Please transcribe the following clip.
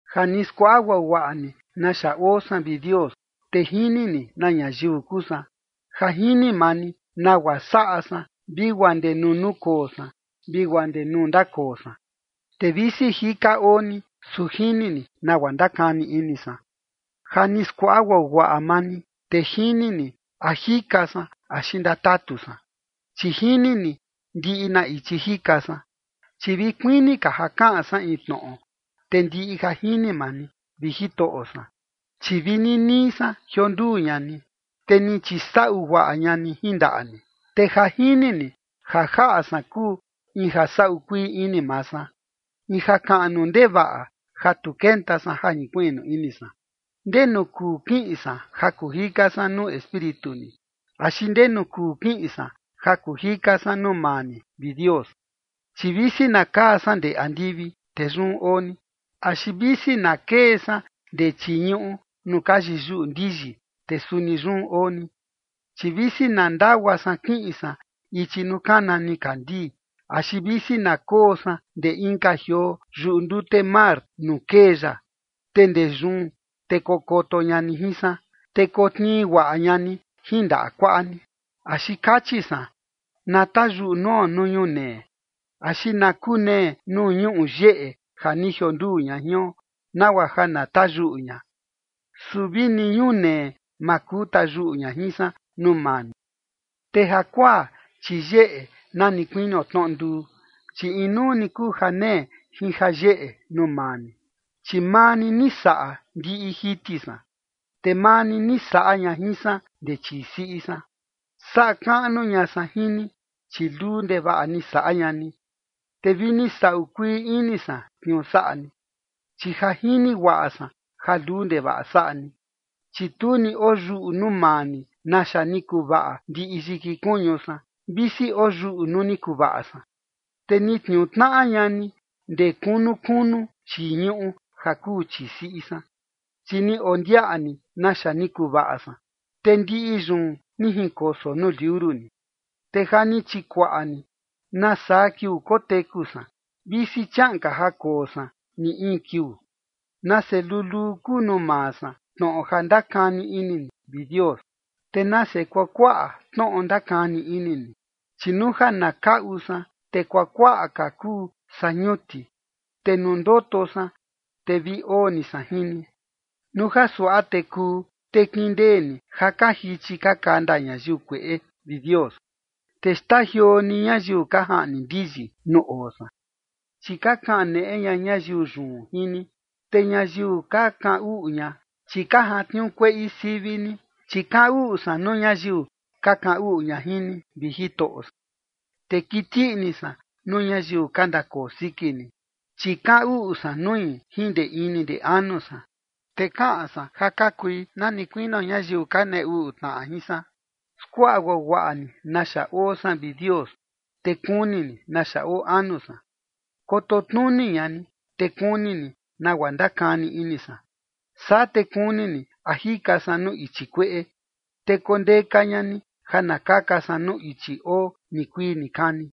Ja ni skuaꞌa guaguaꞌa ni naxa oo san, vi Dios, te jini ni na ñayiu kuu san. Ja jini maa ni nagua saꞌa san vi guaa ndee nuu nukoo san vi guaa ndee nuu ndakoo san. Te visi jika oo ni, su jini ni nagua ndakani ini san. Ja ni skuaꞌa guaguaꞌa maa ni, te jini ni a jika san axi ndatatu san, chi jini ni ndiꞌi na ichi jika san. Chi vi kuini ka ja kaꞌan san in tnoꞌo, te ndiꞌi ja jini maa ni, vi Jitoꞌo san. Chi vi ninii san ni jionduu ña ni, te ni chisaꞌu guaꞌa ña ni jin ndaꞌa ni. Te ja jini ni ja jaꞌa san kuu in ja saꞌu kuii ini maa san, in jakaꞌnu ndevaꞌa, ja tu kenta san ja jinkuiꞌnu ini san. ¿Ndenu kuu kiꞌin san ja kuu jika san nuu espíritu ni? ¿Axi ndenu kuu kiꞌin san ja kuu jika san nuu maa ni, vi Dios? Chi visi na kaa san ndee andivi, te yun oo ni. Axi visi na kee san ndee chii ñuꞌu nuu ka yiyuꞌu ndiyi, te suni yun oo ni. Chi visi na ndagua san kiꞌin san ichi nuu kana nikandii, axi visi na koo san ndee inka jioo yuꞌu ndute mar nuu kee ya, te ndee yun te kokoto ña ni jin san, te kotnii guaꞌa ña ni jin ndaꞌa kuaꞌa ni. Axi kachi san: “Na tayuꞌu nuo nuu ñunee, axi na kunee nuu ñuꞌu yeꞌe ja ni jionduu ña jion nagua ja na tayuꞌu ña”. Su vi ni ñunee, ma kuu tayuꞌu ña jin san nuu maa ni. Te jakuaa, chi yeꞌe na ni kuinio tnoꞌo nduu, chi inuu ni kuu janee jin jayeꞌe nuu maa ni. Chi maa ni ni saꞌa ndiꞌi jiti san, te maa ni ni saꞌa ña jin san ndee chii siꞌi san. Saꞌa kaꞌnu ña san jin ni, chi luu ndevaꞌa ni saꞌa ña ni, te vi ni saꞌu kuii ini san tniuu saꞌa ni, chi ja jini guaꞌa san ja luu ndevaꞌa saꞌa ni. Chi tu ni oyuꞌu nuu maa ni naxa ni kuvaꞌa ndiꞌi yiki kuñu san, visi oyuꞌu nuu ni kuvaꞌa san. Te ni tniuu tnaꞌa ña ni ndee kunu kunu chii ñuꞌu, ja kuu chii siꞌi san. Chi ni ondiaꞌa ni naxa ni kuvaꞌa san, te ndiꞌi yun ni jinkoso nuu liuru ni. Te ja ni chikuaꞌa ni nasaa kiuu koteku san, visi chiaꞌan ka ja koo san ni in kiuu. Nase luluu kuu nuu maa san tnoꞌo ja ndakani ini ni, vi Dios. Te nase kuakuaꞌa tnoꞌo ndakani ini ni. Chi nuu ja na kaꞌu san, te kuakuaꞌa ka kuu saa ñuti. Te nuu ndoto san, te vi oo ni san jin ni. Nuu ja suaꞌa te kuu, te kindee ni ja ka jichi ka kanda ñayiu kueꞌe, vi Dios, te xtajioo ni ñayiu ka jaꞌni ndiyi nuu oo san. Chi ka kaneꞌe ña ñayiu yun jin ni, te ñayiu ka kaꞌan uꞌu ña, chi ka jantniuu kueꞌi sivi ni. Chi kaꞌan uꞌu san nuu ñayiu ka kaꞌan uꞌu ña jin ni, vi Jitoꞌo san, te kiti ini san nuu ñayiu ka ndakoo siki ni. Chi kaꞌan uꞌu san nui jin ndee ini ndee anu san, te kaꞌan san ja ka kui na ni kuinio ñayiu ka nee uꞌu tnaꞌa jin san. Skuaꞌa guaguaꞌa ni naxa oo san, vi Dios, te kuni ni naxa oo anu san. Koto tnuni ña ni, te kuni ni nagua ndakani ini san. Saa te kuni ni a jika san nuu ichi kueꞌe, te kondeka ña ni ja na kaka san nuu ichi oo nikuii nikani.